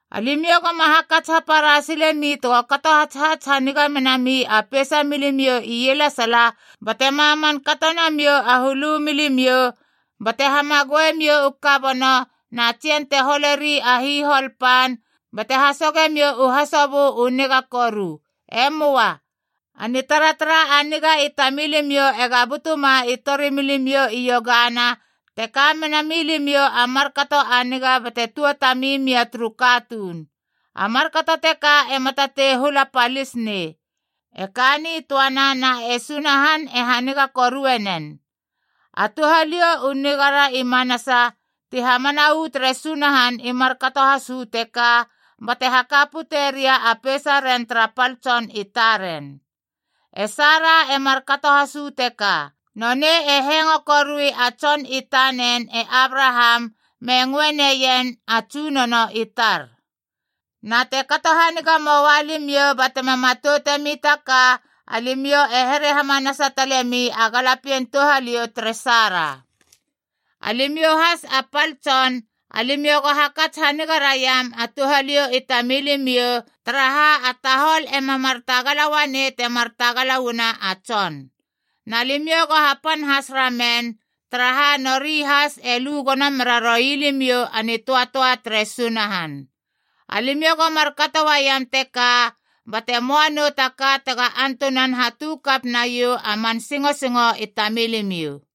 Alimiou goma hakats hapara silemi tego kato hatshats haniga menami a peisa milimiou ielesala, bate maman kato namiou a hulu milimiou bate hamagoemiou u kabono na tsien te holeri a hihol pan bate hasogemiou u hasobö u niga koru. E möa. A nitaratara a niga i tamilimiou ega butuma i torimilimiou i iogana te ka mena milimiou a markato a niga bate tuatamimia turu katuun. A markato teka ema tatei hula palis nei. E ka nitöana, na e Sunahan e haniga korue nen. A touhaliou u nigara i manasa ti hamana uu tere Sunahan i markato has uu teka, bate haka pute ria a peisaren tara pal tson i taren. E Sara e markato has uu teka. Nonei e hengo korui a tson i tanen e Abraham me ngöe neien “A tsunono i tar.” Na te kato haniga moua limiou ba tema matoutemi ta ka, alimiou e here hamanasa talemi a galapien touhaliou tere Sara. Alimiou has a pal tson, alimiou go hakats haniga raiam a touhaliou i tamilimiou, taraha a tahol ema mar tagala uanei temar tagala uana a tson. Na limiou go hapan has ramen, taraha nori has e lu gono mera roi limiou a nitöatöa tere Sunahan. Alimiou go markato uaiam teka, bate möa nou taka tega antunan hatu kap naiou a man singosingo i tamilimiou.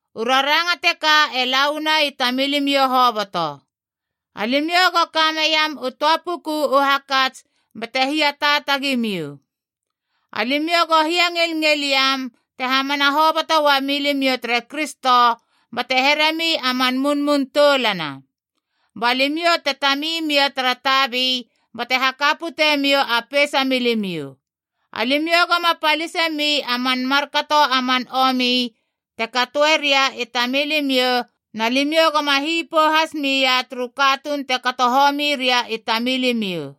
U raranga teka e la uana i tamilimiou hoboto. Alimiou go ka meiam u töa puku u hakats bate hiataatagi miou. Alimiou go hiangilngil iam te hamana hoboto uamilimiou tere Kristo bate heremi a man munmun toulana. Ba limiou te tami mia tara tabi bate haka putemiou a peisa milimiou. Alimiou goma palisemi a man markato a man omi te katoe ria tamilimiou, na limiou goma hipou has mia turu katuun te kato homi ria i tamilimiou.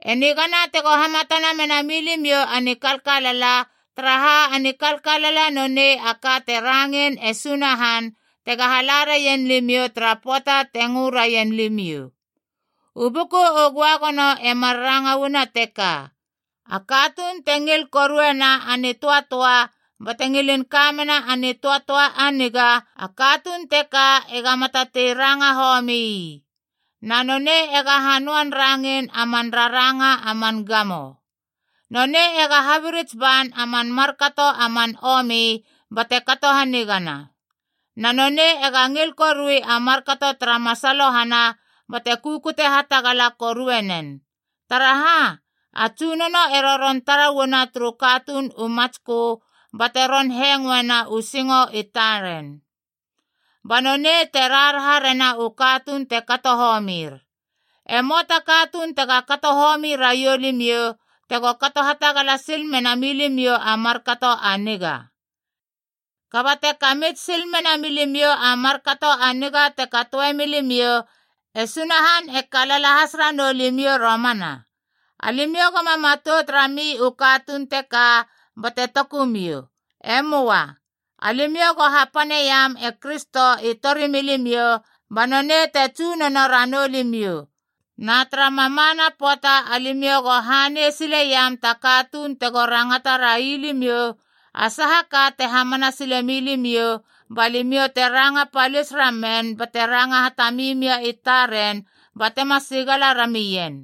E nigana tego hamatana mena milimiou a nikalkalala, taraha a nikalkalala nonei a ka te rangein e Sunahan tega hala raien limiou tara pöata te ngö raien limiou. U Buku u Göagono e mar ranga uana teka: “A katuun te ngil koruena a nitöatöa bate ngilin ka mena a nitöatöa a niga, a katuun teka ega matatei ranga homii. Na nonei ega hanöan rangein a man raranga a man gamo. Nonei ega habirits ban a man markato a man omi bate kato hanigana. Na nonei ega ngil korui a markato tara masalohana bate kukute hatagala korue nen. Taraha, a Tsunono e roron tara uana turu katuun u matskö bate ron hengoena u singo i taren. Ba nonei te raharaha rena u katuun te kato homir.” E möa ta katuun tega kato homi raiou limiou, tego kato hatagala sil mena milimiou a markato a niga. Kaba te kamits sil mena milimiou a markato a niga te katoe milimiou, e Sunahan e kalala has ranou limiou romana! Alimiou goma matout rami u katuun teka, bate toku miou. E möa. Alimiou go hapaneiam e Kristo i tori milimiou, ba nonei te Tsunono ranou limiou. Na tara mamana pöata alimiou go hanei sileiam ta katuun tego rangata railimiou a saha ka te hamana sile milimiou, ba limiou te ranga palis ramen bate ranga hatami mia i taren batema sigala ramien.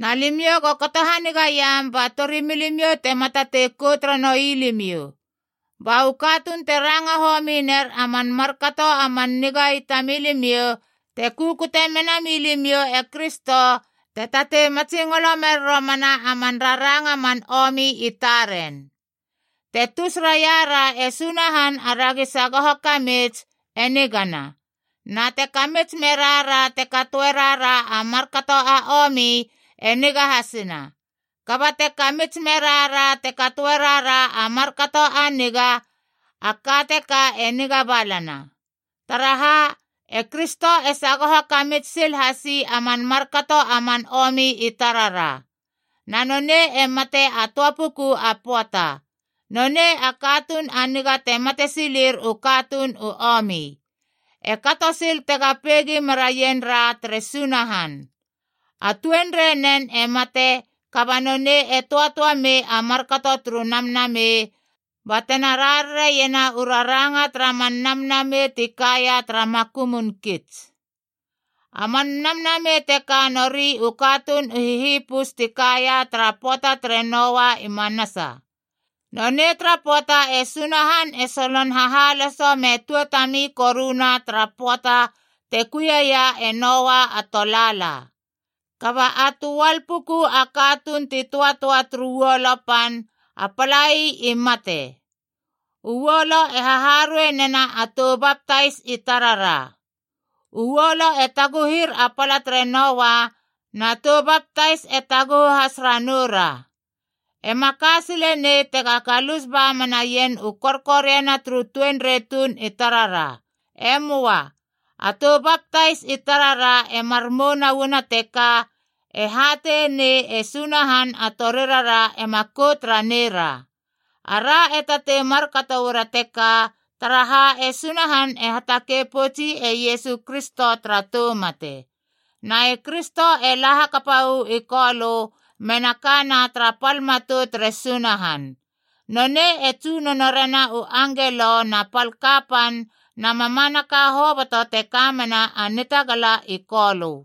Na limiou go kato hanigaiam ba torimilimiou tema tatei kout ranoui limiou. Ba u katuun te ranga homi ner a man markato a man niga i tamilimiou, te kukute mena milimiou e Kristo, te tatei matsingolo mer romana a man raranga a man omi i taren. Te tus raira e Sunahan aragi sagoho kamits, e nigana. Na te kamits merara te katoe rara a markato a omi, e niga hasina. Kaba te kamits merara te katoe rara a markato a niga, a ka teka e niga balana. Taraha, e Kristo e sagoho kamits sil hasi a man markato a man omi i tarara. Na nonei e matea a töa puku a pöata. Nonei a katuun a niga te mate silir u katuun u omi. E kato sil tega peigi meraien ra tere Sunahan. A tuenreinen e mate, kaba nonei e töatöa mei a markato turu namnamei, batena rarariena u raranga tara man namnamei ti kaia tara makumun kits. A man namnamei teka nori u katuun u hihipus ti kaia tara pöata tere Noa i manasa. Nonei tara pöata e Sunahan e solon hahaloso me tuatami koruna tara pöata te kuie ia e Noa a tolaala. Kaba a töal puku a katuun ti töatöa turu uolo pan, a palai i mate. U uolo e haharuei nena a tou baptais i tarara. U uolo e taguhir a pala tere Noa, na tou baptais e taguhu has ranou ra. E ma ka sile nei tega galus ba menaien u korkoriana turu tuenrei tuun i tarara. E möa. A tou baptais i tarara e mar mouna uana teka, e hateie nei e Sunahan a torirara ema kout raneira. Ara e tatei markato uara teka, taraha e Sunahan e hatakei poutsi e Iesu Kristo tara tou mate. Na e Kristo e la hakapa uu i Kolö mena kana tara pal matou tere Sunahan. Nonei e tsunono rena u angelo na pal kapan na mamanaka hoboto te kamena a nitagala i Kolö.